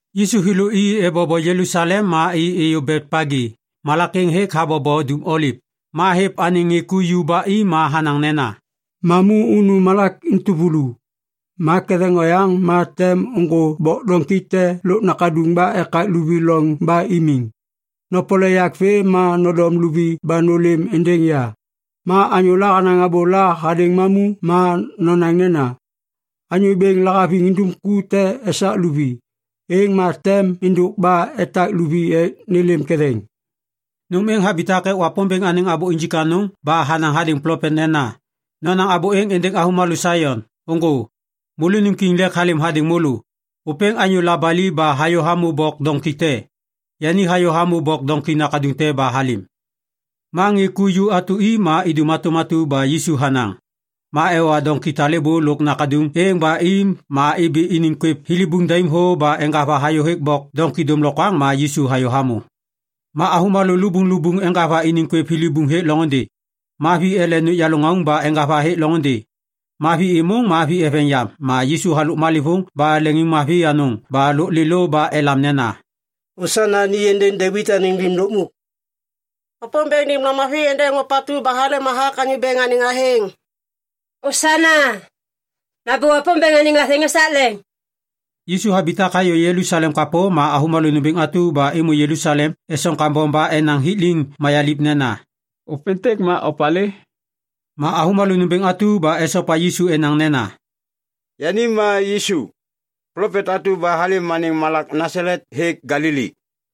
Yisu thêlô i ebobo Jelusalem ma i êyô Betpagi, malak êŋ hêk habobo Dum Oliv. Ma hêv anêŋ ŋê ku ju ba i ma hanaŋ nena, “Mamu unu malak entuvulu. Ma ketheŋ oyaŋ ma tem ôŋgô bok doŋki te lôk nakaduŋ ba ekak luvi loŋ ba imiŋ. Nopole yak vê ma nodom luvi ba nôlêm êndêŋ ya. Ma anyôla hanaŋ abôla hadêŋ mamu, ma nonaŋ nena, ‘Anyô Bêŋ lahaviŋ indum ku te esak luvi’, êŋ ma tem êndôk ba etak luvi ek nêlêm ketheŋ.” Nôm êŋ habitak ek Wapômbêŋ anêŋ abô injik anôŋ ba hanaŋ hadêŋ plopet nena, “Nonaŋ abô êŋ êndêŋ avômalô Saion, ‘Ôŋgô. Môlônim kiŋ lêk halêm hadêŋ môlô. Ôpêŋ anyô labali ba hayô hamô bok doŋki te. Yani hayô hamô bok doŋki nakaduŋ te ba halêm.’” Ma ŋê ku ju atu i ma idum hatôm atu ba Yisu hanaŋ. Ma ewa doŋki talêbô lôk nakaduŋ êŋ ba i ma ibi iniŋ kwêv thilibuŋ daim thô ba eŋgava hayôhêk bok doŋki dômlokwaŋ ma Yisu hayô hamô. Ma avômalô lubuŋlubuŋ eŋgava iniŋ kwêv thilibuŋ hêk loŋôndê. Ma vi ele nôkyalô ŋauŋ ba eŋgava hêk loŋôndê. Ma vi êmôŋ ma vi eveŋ yam ma Yisu halôk malêvôŋ ba leŋiŋmavi anôŋ ba lôk lêlô ba elam nena, “Osana ni êndêŋ Devit anêŋ Lim Lukmuk!” “Wapômbêŋ nêm lamavi êndêŋ ôpatu ba halêm hathak Anyô Bêŋ anêŋ athêŋ!” “Osana! Nambô Wapômbêŋ anêŋ athêŋ esak leŋ!” Yisu habitak hayô Jelusalem kapô ma avômalô nômbêŋ atu ba êmô Jelusalem esoŋ kambom ba enaŋ hik liŋ mayaliv nena, “Ôpêntêk ma opalê?” Ma avômalô nômbêŋ atu ba esopa Yisu enaŋ nena, “Yani ma Yisu, plopet atu ba halêm anêŋ malak Nasalet hêk Galili.”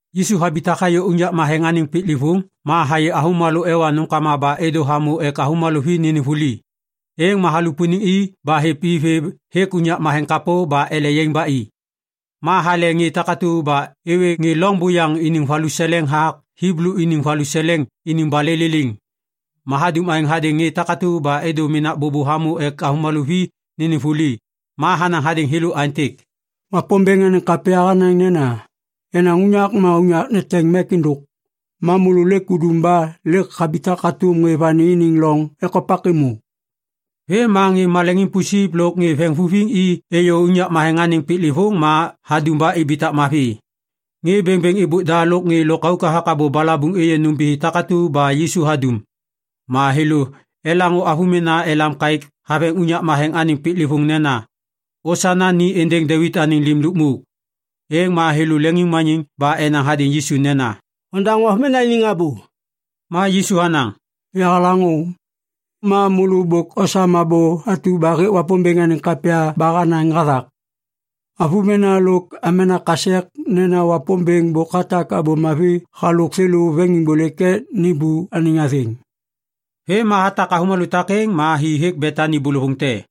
Yisu habitak hayô unyak matheŋ kapô anêŋ piklêvôŋ ma hayê avômalô ewa nômkama ba êdô hamô ek avômalô vi nênêm vuli. Êŋ ma halupuniŋ i ba hêv i vê hêk unyak matheŋ kapô ba ele yaiŋ ba i. Ma hale ŋê takatu ba êwê ŋê loŋ buyaŋ iniŋ valuseleŋ hathak Hiblu iniŋ valuseleŋ iniŋ balê liliŋ. Ma hadum aêŋ hadêŋ ŋê takatu ba êdô menak bôbô hamô ek avômalô vi nênêm vuli. Ma hanaŋ hadêŋ thêlô aêntêk, “Wapômbêŋ anêŋ kapya hanaŋ nena, ‘Yenaŋ unyak ma unyak neteŋ mek êndôk.’ Ma môlô lêk udum ba lêk habitak hatôm ŋê vani iniŋ loŋ ekopak êmô.” Vêm ma ŋê maleŋiŋ pusip lôk ŋê veŋvuviŋ i êyô unyak matheŋ anêŋ piklêvôŋ ma hadum ba ibitak mavi. Ŋê bêŋbêŋ êbôk da lôk ŋê lôkauk hathak abô balabuŋ êyê nômbithi takatu ba Yisu hadum. Ma thêlô elaŋô avômena elam kaêk haveŋ unyak matheŋ anêŋ piklêvôŋ nena, “Osana ni êndêŋ Devit anêŋ Lim Lukmuk!” Êŋ ma thêlô leŋiŋmaniŋ ba enaŋ hadêŋ Yisu nena, “Ondaŋô avômena iniŋ abô!” Ma Yisu hanaŋ, “Yahalaŋô. Ma môlô bôk osam abô atu ba hêk Wapômbêŋ anêŋ kapya ba hanaŋ hathak “‘Avômena lôk amena kasek nena Wapômbêŋ bôk hatak abô mavi halôk thêlô veŋiŋbôlêk ek nêmbô anêŋ athêŋ.’” Vêm ma hatak avômalô takêŋ ma hi hêk Betani bôlôvôŋ te.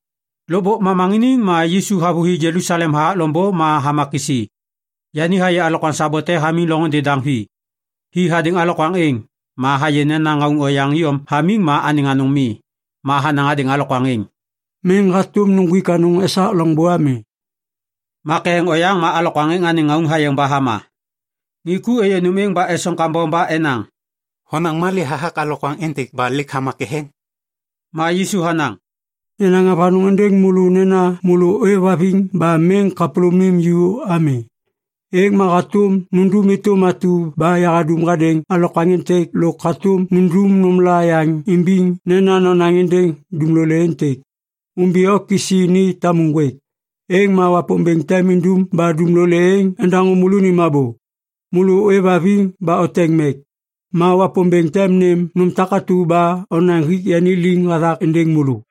Lôkbôk momaŋiniŋ ma Yisu havôhi Jelusalem hathak loŋbô ma hama kisi. Yani hayê alokwaŋ sabo te hamiŋ loŋôndê daŋ vi. Hi hadêŋ alokwaŋ êŋ, ma hayê nena ŋauŋ oyaŋ iyom hamiŋ ma anêŋ anôŋ mi. Ma hanaŋ hadêŋ alokwaŋ êŋ, “Miŋ hatôm nuŋgwik anôŋ esak loŋbô ami!” Ma ketheŋ oyaŋ ma alokwaŋ êŋ anêŋ ŋauŋ hayeŋ ba hama. Ŋê ku êyê nôm êŋ ba esoŋ kambom ba enaŋ, “Honaŋ malê hathak alokwaŋ êntêk ba lêk hama ketheŋ?” Ma Yisu hanaŋ, “Yanaŋ avanôŋ êndêŋ môlô nena môlô ôêvhaviŋ ba miŋ kapôlômim ju ami, êŋ ma hatôm nundum êtôm atu ba yahadum hadêŋ alokwaŋ êntêk lôk hatôm nundum nômla yaŋ imbiŋ nena nonaŋ êndêŋ dumlolê êntêk, ‘Ômbi o kisi ni tamu ŋgwêk.’ Êŋ ma Wapômbêŋ tem indum ba dumlolê êŋ endaŋô môlônim abô. Môlô ôêvhaviŋ ba oteŋ mek, ma Wapômbêŋ tem nêm nôm takatu ba onaŋ hik yani liŋ hathak êndêŋ môlô.”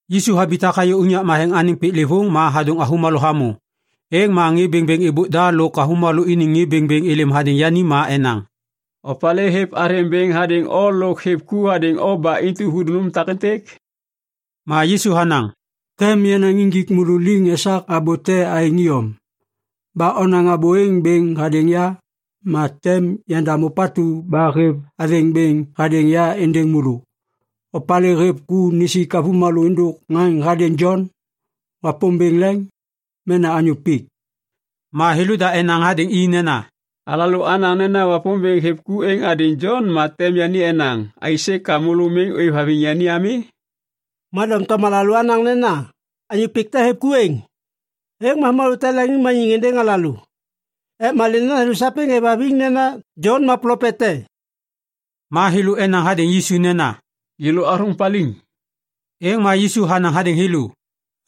Yisu habitak hayô unyak matheŋ anêŋ piklêvôŋ ma hadôŋ avômalô hamô. Êŋ ma ŋê bêŋbêŋ êbôk da lôk avômalô iniŋ ŋê bêŋbêŋ êlêm hadêŋ yani ma enaŋ, “Opalê hêv athêŋ bêŋ hadêŋ o lôk hêv ku hadêŋ o ba intu hudum nôm takêntêk?” Ma Yisu hanaŋ, “Tem yanaŋ injik môlô liŋ esak abô te aêŋ iyom. Ba onaŋ abô êŋ bêŋ hadêŋ ya, ma tem yandam ôpatu ba hêv athêŋ bêŋ hadêŋ ya êndêŋ môlô. Opalê hêv ku nisik avômalô êndôk ŋaŋ hadêŋ Jon? Wapômbêŋ leŋ? Mena anyô pik?” Ma thêlôda enaŋ hadêŋ i nena, “Alalô anaŋ nena Wapômbêŋ hêv ku êŋ hadêŋ Jon ma tem yani enaŋ, ‘Aisê ka môlô miŋ ôêvhaviŋ yani ami?’ Ma doŋtom alalô anaŋ nena, ‘Anyô pik te hêv ku êŋ,’ êŋ ma avômalô tem leŋiŋmaniŋ êndêŋ alalô. Ek malê nena thêlô sapêŋ êvhaviŋ nena Jon ma plopet te.” Ma thêlô enaŋ hadêŋ Yisu nena, “Yêlô athôŋ paliŋ.” Êŋ ma Yisu hanaŋ hadêŋ thêlô,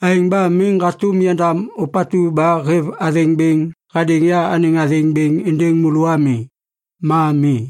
“Aêŋ ba miŋ hatôm yandam ôpatu ba hêv athêŋ bêŋ hadêŋ ya anêŋ athêŋ bêŋ êndêŋ môlô ami. Ma mi.”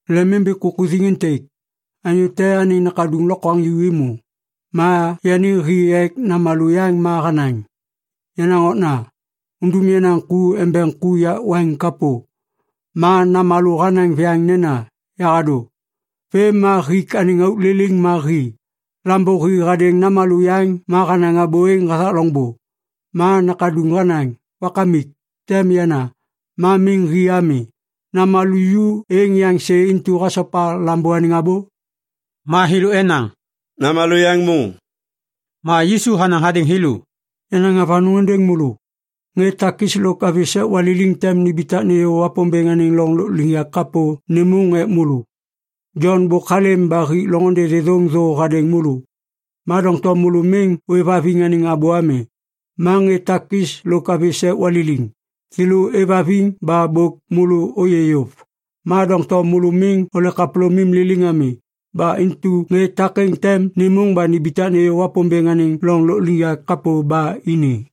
“Lemimbi kukuthiŋ êntêk. Anyô te anêŋ nakaduŋ lokwaŋju êmô. Ma yani hi ek namalô yaŋ ma hanaŋ, ‘Yenaŋ okna! Undum yenaŋ ku embeŋ ku yak waiŋ kapô!’ “Ma namalô hanaŋ viyaŋ nena, ‘Yahadô.’ Vêm ma hik anêŋ auk liliŋ ma hi. “Lambô hi hadêŋ namalô yaŋ ma hanaŋ abô êŋ hathak loŋbô. Ma nakaduŋ hanaŋ, ‘Wakamik, tem yana’. Ma miŋ hi ami. “Namalô ju êŋ yaŋ sê intu hasopa lambô anêŋ abô?” Ma thêlô enaŋ, “Namalô yaŋ môŋ.” Ma Yisu hanaŋ hadêŋ thêlô, “Yanaŋ avanôŋ êndêŋ môlô. Ŋê takis lôk avi sek waliliŋ tem nimbitak nêyô Wapômbêŋ anêŋ loŋ lôkliŋyak kapô nêmôŋ ek môlô. Jon bôk halêm ba hik loŋôndê thêthôŋ thô hadêŋ môlô. Ma doŋtom môlô miŋ ôêvhaviŋ anêŋ abô ami. Ma ŋê takis lôk avi sek waliliŋ, thêlô êvhaviŋ ba bôk môlô ôyê yôv. Ma doŋtom môlô miŋ ole kapôlômim liliŋ ami. Ba intu ŋê takêŋ tem nêmôŋ ba nimbitak nêyô Wapômbêŋ anêŋ loŋ lôkliŋyak kapô ba ini.”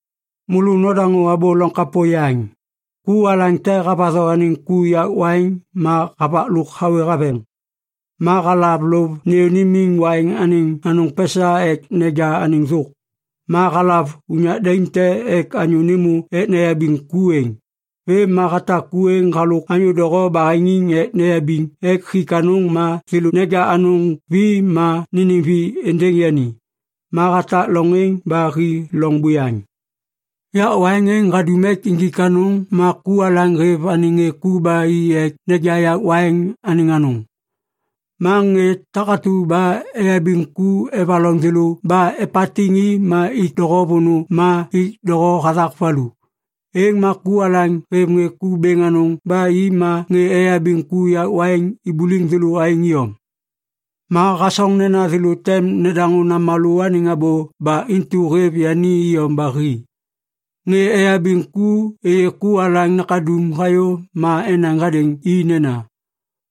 “Môlô nodaŋô abô loŋ kapô yaŋ. Ku alaŋ te havatho anêŋ ku yak waiŋ ma havak lôk hawê haveŋ. Ma halav lôv nêyô nimiŋ waiŋ anêŋ anôŋ pesa ek neja anêŋ thôk. Ma halav unyak daim te ek anyô nêmô ek neyabiŋ ku êŋ. Vêm ma hatak ku êŋ halôk anyô doho baheŋiŋ ek neyabiŋ ek hik anôŋ ma thêlô neja anôŋ vi ma nênêm vi êndêŋ yani. Ma hatak loŋ êŋ ba hi loŋ buyaŋ. “Yak waiŋ êŋ hadum ek injik anôŋ ma ku alaŋ hêv anêŋ ŋê ku ba i ek neja yak waiŋ anêŋ anôŋ. Ma ŋê takatu ba eyabiŋ ku evaloŋ thêlô ba epatiŋ i ma ik doho vônô ma ik doho hathak valu. Êŋ ma ku alaŋ hêv ŋê ku bêŋ anôŋ ba i ma ŋê eyabiŋ ku yak waiŋ ibuliŋ thêlô aêŋ iyom. “Ma hasoŋ nena thêlô tem nedaŋô namalô anêŋ abô ba intu hêv yani iyom ba hi. Ŋê eyabiŋ ku êyê ku alaŋ nakaduŋ hayô ma enaŋ hadêŋ i nena,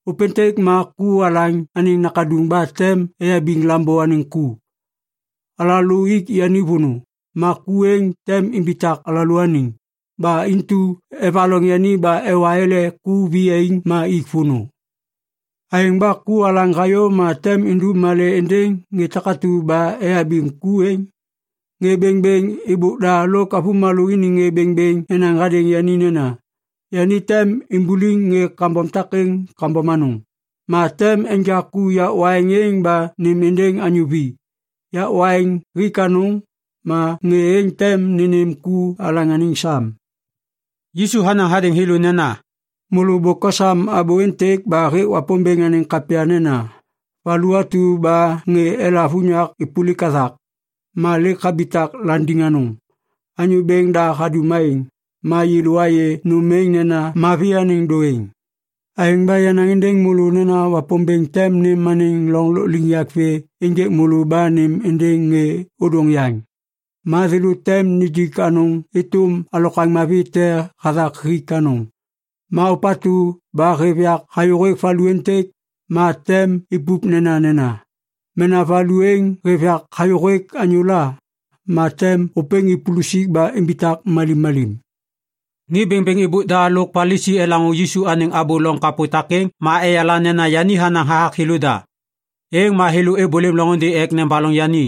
‘Ôpêntêk ma ku alaŋ anêŋ nakaduŋ ba tem eyabiŋ lambô anêŋ ku. Alalô ik yani vônô, ma ku êŋ tem imbitak alalôaniŋ.’ Ba intu evaloŋ yani ba ewa ele ku viyaiŋ ma ik vônô. “Aêŋ ba ku alaŋ hayô ma tem indum malê êndêŋ ŋê takatu ba eyabiŋ ku êŋ?” Ŋê bêŋbêŋ êbôk da lôk avômalô iniŋ ŋê bêŋbêŋ enaŋ hadêŋ yani nena, “Yani tem imbuliŋ ŋê kambom takêŋ kambom anôŋ. Ma tem enja ku yak waiŋ êŋ ba nêm êndêŋ anyô vi. Yak waiŋ hik anôŋ, ma ŋê êŋ tem nênêm ku alaŋ anêŋ sam.” Yisu hanaŋ hadêŋ thêlô nena, “Môlô bôk osam abô êntêk ba hêk Wapômbêŋ anêŋ kapya nena, “‘Valu atu ba ŋê elav unyak êpôlik hathak, ma lêk habitak landiŋ anôŋ. Anyô Bêŋ da hadum aêŋ, ma yêlô ayê nôm êŋ nena mavi anêŋ dôêŋ.’ “Aêŋ ba yanaŋ êndêŋ môlô nena Wapômbêŋ tem nêm anêŋ loŋ lôkliŋyak vê ênjêk môlô ba nêm êndêŋ ŋê ôdôŋ yaŋ. Ma thêlô tem nijik anôŋ êtôm alokwaŋ mavi te hathak hik anôŋ. Ma ôpatu ba hêv yak hayôhêk valu êntêk, ma tem ipup nenanena. Mena valu êŋ hêv yak hayôhêk anyôla, ma tem ôpêŋ ipulusik ba imbitak malimmalim.” Ŋê bêŋbêŋ êbôk da lôk Palisi elaŋô Yisu anêŋ abô loŋ kapô takêŋ ma eyala nena yani hanaŋ hathak thêlôda. Êŋ ma thêlô êbôlêm loŋôndê ek nebaloŋ yani.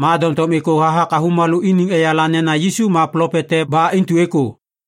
Ma doŋtom êkô hathak avômalô iniŋ eyala nena Yisu ma plopet te ba intu êkô.